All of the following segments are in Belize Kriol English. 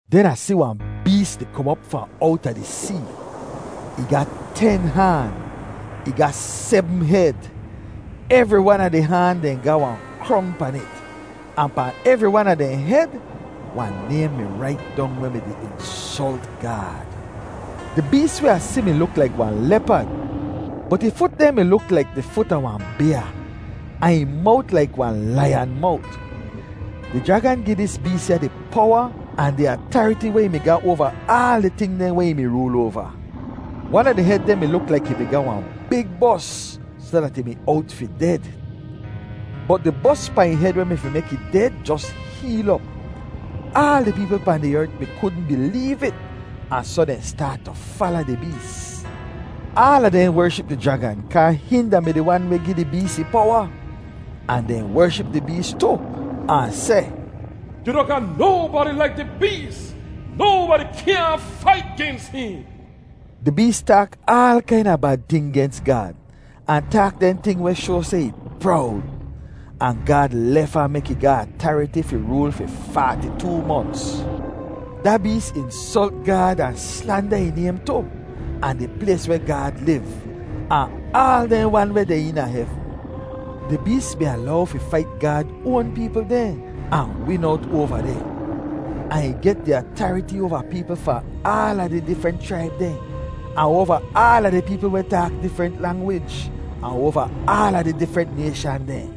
Den Ah si wahn bees di kom op fahn owta di see. Ih ga ten haan. Ih ga sebm hed. Evri wan a di haan dehn ga wahn krong pan it. Ahn pahn evri wan a dehn hed, wahn naym mi rait dong weh mi-di insolt Gaad. Di bees weh Ah si mi luk laik wahn lepad, bot ih fut dehn mi luk laik di fut a wahn byaa, ahn ih mowt laik wahn laiyan mowt. Di jragan gi dis bees ya di powa ahn di atariti weh ih mi ga oava aal di ting dehn weh ih mi rool oava. Wan a di hed dehn mi luk laik ih mi ga wahn big bos soh dat ih mi owt fi ded. Bot di bos pahn ih hed weh mi fi mek ih ded jos heel op. Aal di peepl pahn di ert mi kudn bileev it ahn soh dehn staat tu fala di bees. Aala dehn wership di jragan kaa hihn da-mi di wan weh gi di bees ih powa. Ahn dehn wership di bees tu, ahn seh, “Yu noh ga nobadi laik di bees. Nobadi kyaahn fait gens hihn!” Di bees taak aal kaina bad ting gens Gaad ahn taak dehn ting weh shoa seh ih prowd. Ahn Gaad lef ahn mek ih ga atariti fi rool fi faati-too monts. Da bees insolt Gaad ahn slanda ih naym tu, ahn di plays weh Gaad liv, ahn aal dehn wan weh deh eena hevn. Di bees mi alow fi fait Gaad oan peepl dehn ahn win owt oava dehn. Ahn ih get di atariti oava peepl fahn aala di difrent chraib dehn, ahn oava aala di peepl weh taak difrent langwij, ahn oava aala di difrent nayshan dehn.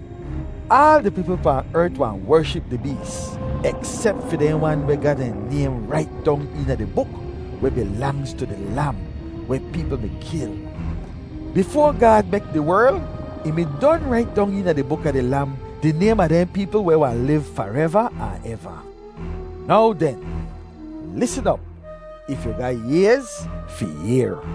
Aal di peepl pahn ert wahn wership di bees, eksep fi dehn wan weh ga dehn naym rait dong eena di buk weh bilangz tu di Lam weh peepl mi kil. Bifoa Gaad mek di werl, ih mi don rait dong eena di buk a di Lam, di naym a dehn peepl weh wahn liv fareva ahn eva. Now den, lisn op, if yu ga ayz fi yehr!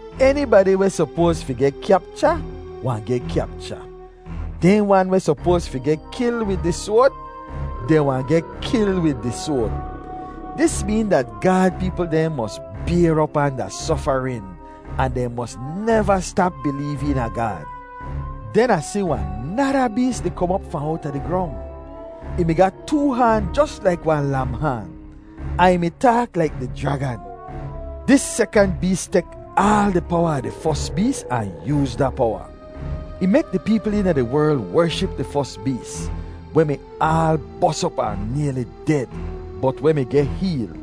Enibadi weh sopoaz fi geh kyapcha, wahn geh kyapcha. Dehn wan weh sopoaz fi geh kil wid di soad, dehn wahn geh kil wid di soad. Dis meen dat Gaad peepl dehn mos bayr op anda sofarin ahn dehn mos neva stap bileev eena Gaad. Den Ah si wahn nada bees di kom op fahn owta di grong. Ih mi ga too haan jos laik wahn lam haan, ahn ih mi taak laik di jragan. Dis sekant bees tek aal di powa a di fos bees ahn yooz da powa. Ih mek di peepl eena di werl wership di fos bees, weh mi aal bos op ahn nayli ded, bot weh mi geh heel.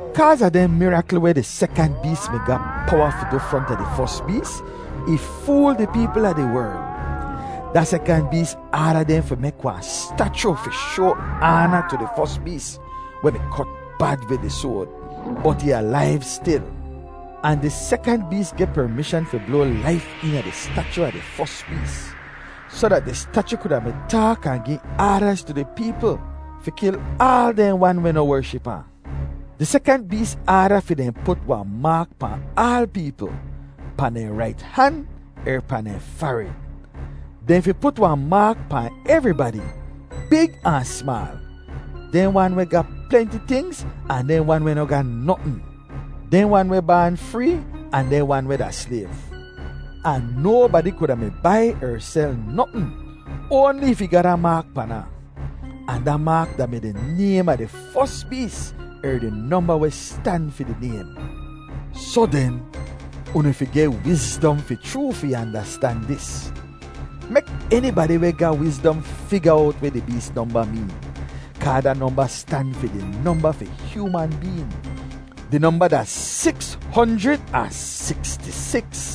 Kaaz a dehn mirakl weh di sekant bees mi ga powa fi du fronta di fos bees, ih fool di peepl a di werl. Da sekant bees aada dehn fi mek wahn stachu fi shoa aana tu di fos bees weh mi kot bad wid di soad, bot ih alaiv stil. Ahn di sekant bees geh permishan fi bloa laif eena di stachu a di fos bees, soh dat di stachu kuda mi taak ahn gi aadaz tu di peepl fi kil aal dehn wan weh noh wership ahn. Di sekant bees aada fi dehn put wahn maak pahn aal peepl, pahn dehn rait han er pahn dehn farid. Dehn fi put wahn maak pahn evribadi, big ahn smaal, dehn wan weh ga plenti tingz ahn dehn wan weh noh ga notn, dehn wan weh baan free ahn dehn wan weh da slayv. Ahn nobadi kuda mi bai er sel notn, oanli if ih ga da maak pan ahn. Ahn da maak da-mi di naym a di fos bees er di nomba weh stan fi di naym. Soh den, unu fi geh wizdom fi chroo fi andastan dis. Mek enibadi weh ga wizdom figa owt weh di bees nomba meen, kaa da nomba stan fi di nomba fi hyooman been. Di nomba da siks honjrid ahn siksti-siks.